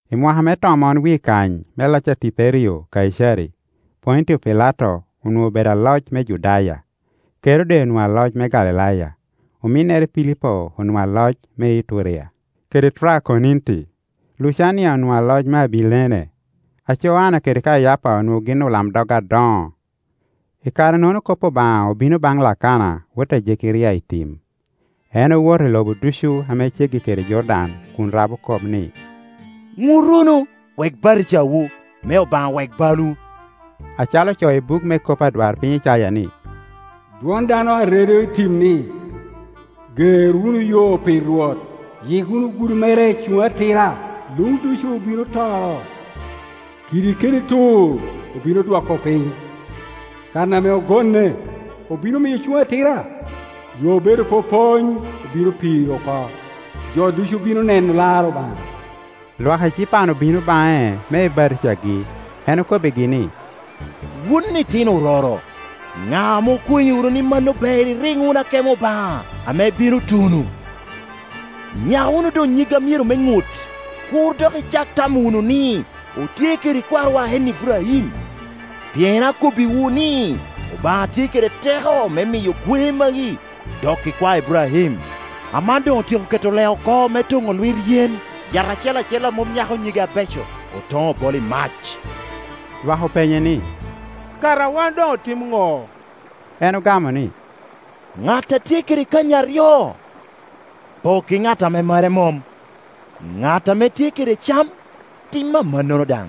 I mwaka me tomon wie kany me loc a Tiberio Kaicari, Pontio Pilato onwoŋo obedo aloc me Judaya, Kerode onwoŋo aloc me Galilaya, ominnere Pilipo onwoŋo aloc me Iturea kede Trakoniti, Lucania onwoŋo aloc me Abilene, aco Anna kede Kayapa onwoŋo gin olamdog adoŋo; i kare-nono kop Obaŋa obino baŋ Lakana wot a Jekeria i tim. En owoto i lobo ducu ame ceggi kede Jordan kun rabo kop ni, “Ŋut wunu, wek batijawu, me Obaŋa wek balwu”, acalo ocoo i buk me kop adwarpiny Icaya ni, “Dwon dano a redo i tim ni, Ger wunu yo pi Rwot, yik wunu gudo mere cuŋ atira, Luŋ ducu obino toro, kidi kede tur obino odwoko piny, kan ame ogonne obino miyo cuŋ atira, yo obedo popony obino piro oko; jo ducu bino neno lar Obaŋa.” Lwak ecipan obino baŋe me ebatijagi; en okobbigi ni, “Wun itino ororo, ŋa ame okwenyorowu ni mano ber iriŋ wunu akemo Obaŋa ame bino tuno? Nyak wunu doŋ nyig a myero me ŋut, kur dok icak tamo wunu ni, ‘Otye kede kwarowa en Iburaim’; pien akobbiwu ni, Obaŋa tye kede te ko me miyo gweŋe magi doko ikwae Iburaim. Aman doŋ otyeko keto lee oko me toŋo lwit yen; yat acel acel a mom nyako nyige abeco, otoŋo, obolo i mac.” Lwak openye ni, “Kara wan doŋotim ŋo?” En ogamo ni, “Ŋat a tye kede kanyi aryo, pok i ŋat ame mere mom; ŋat ame tye kede cam, tim amannono daŋ.”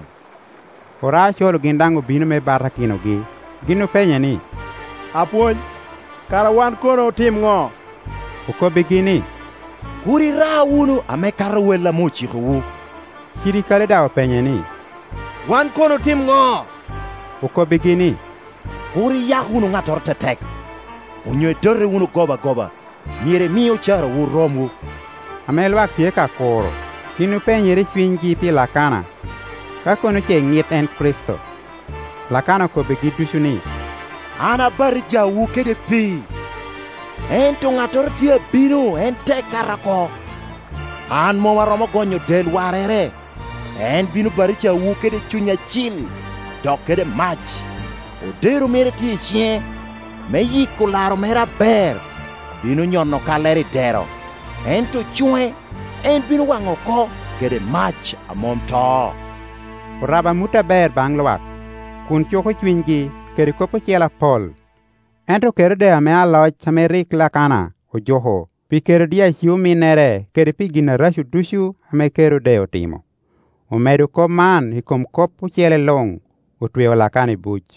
Oraocoro gin daŋ obino me batakinogi; gin openye ni, “Apwony, kara wan kono otim ŋo?” Okobbigi ni, “Kur ira wunu ame kato wel ame ocikowu.” Cirikali daŋ openye ni, “Wan kono otim ŋo?” Okobbigi ni, “Kur iyak wunu ŋattoro tetek, onyo idote wunu gobagoba; myero imi ocarawu romwu.” Ame lwak tye ka kuro, gin openyere i cunygi pi Lakana, ka kono ce ŋit en Kricito. Lakana okobbigi ducu ni, “An abatijawu kede pii, ento ŋattoro tye ame abino, en tek kata oko; an mom aromo gonyo del warrere. En bino batijawu kede Cuny Acil, dok kede mac. Odero mere tye i ciŋe, me yiko laro mere aber; bino nyono kallere i dero, ento cuŋe en bino waŋo oko kede mac a mom to.” Orabo amut aber baŋ lwak, kun cuko cunygi kede kop ocele apol. Ento Kerode ame aloc ame rik en Lakana ojuko pi Kerodia ci-ominnere, kede pi gin areco ducu ame Kerode otimo, omedo kop man i kom kop ocele Iuŋ, otweo Lakana i buc.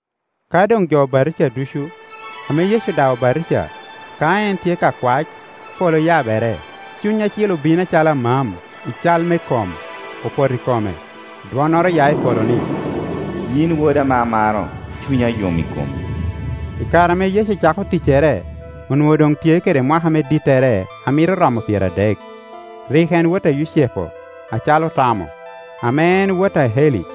Ka doŋ jo obatija ducu, ame Yecu daŋ obatija, ka en tye ka kwac, polo oyabere. Cuny Acil obino acalo amam i cal me kom, opoto i kome. Dwonnoro oya i polo ni, “Yin woda ame amaro, cunya yom i komi.” I kare ame Yecu cako ticcere, onwoŋo doŋ tye kede mwaka me dittere a mito romo pyeradek. Rik en wot a Yucepu, acalo otamo, ame en wot a Eli,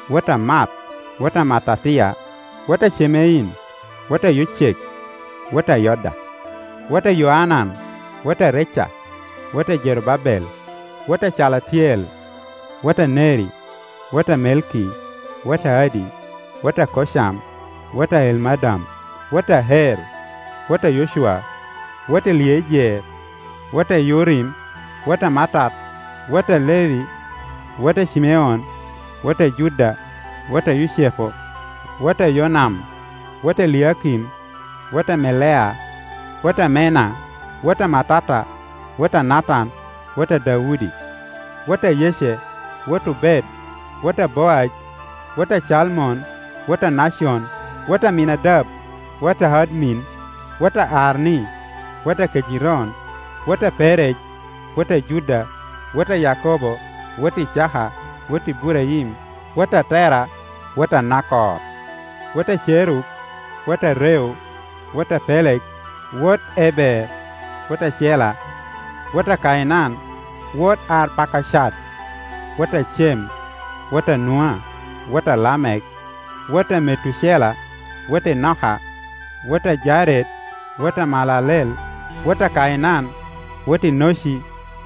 wot a Maat, wot a Mattatia, wot a Cemein, wot a Yocek, wot a Yoda, wot a Yoanan, wot a Reca, wot a Jerubabel, wot a Calatiel, wot a Neri, wot a Melki, wot a Addi, wot a Kocam, wot a Elmadam, wot a Er, wot a Yocwa, wot Eliejer, wot a Yorim, wot a Mattat, wot a Levi, wot a Cimeon, wot a Juda, wot a Yucepu, wot a Yonam, wot a Eliakim, wot a Melea, wot a Menna, wot a Mattata, wot a Natan, wot a Daudi wot a Yece, wot Obed, wot a Boaj, wot a Calmon, wot a Nacon, wot Aminadab, wot Admin, wot a Arni, wot a Kejeron, wot a Perej, wot a Juda, wot a Yakobo, wot Icaka, wot Iburaim, wot a Tera, wot a Nakor, wot a Cerug, wot a Reu, wot a Peleg, wot Eber, wot a Cela, wot a Kainan, wot Arpakaead, wot a Cem, wot a Nua, wot a Lamek, wot a Metucela, wot Enoka, wot a Jared, wot a Maalalel, wot a Kainan, wot Enoci,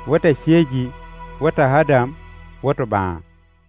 wot a Ceji, wot Adam, wot Obaŋa.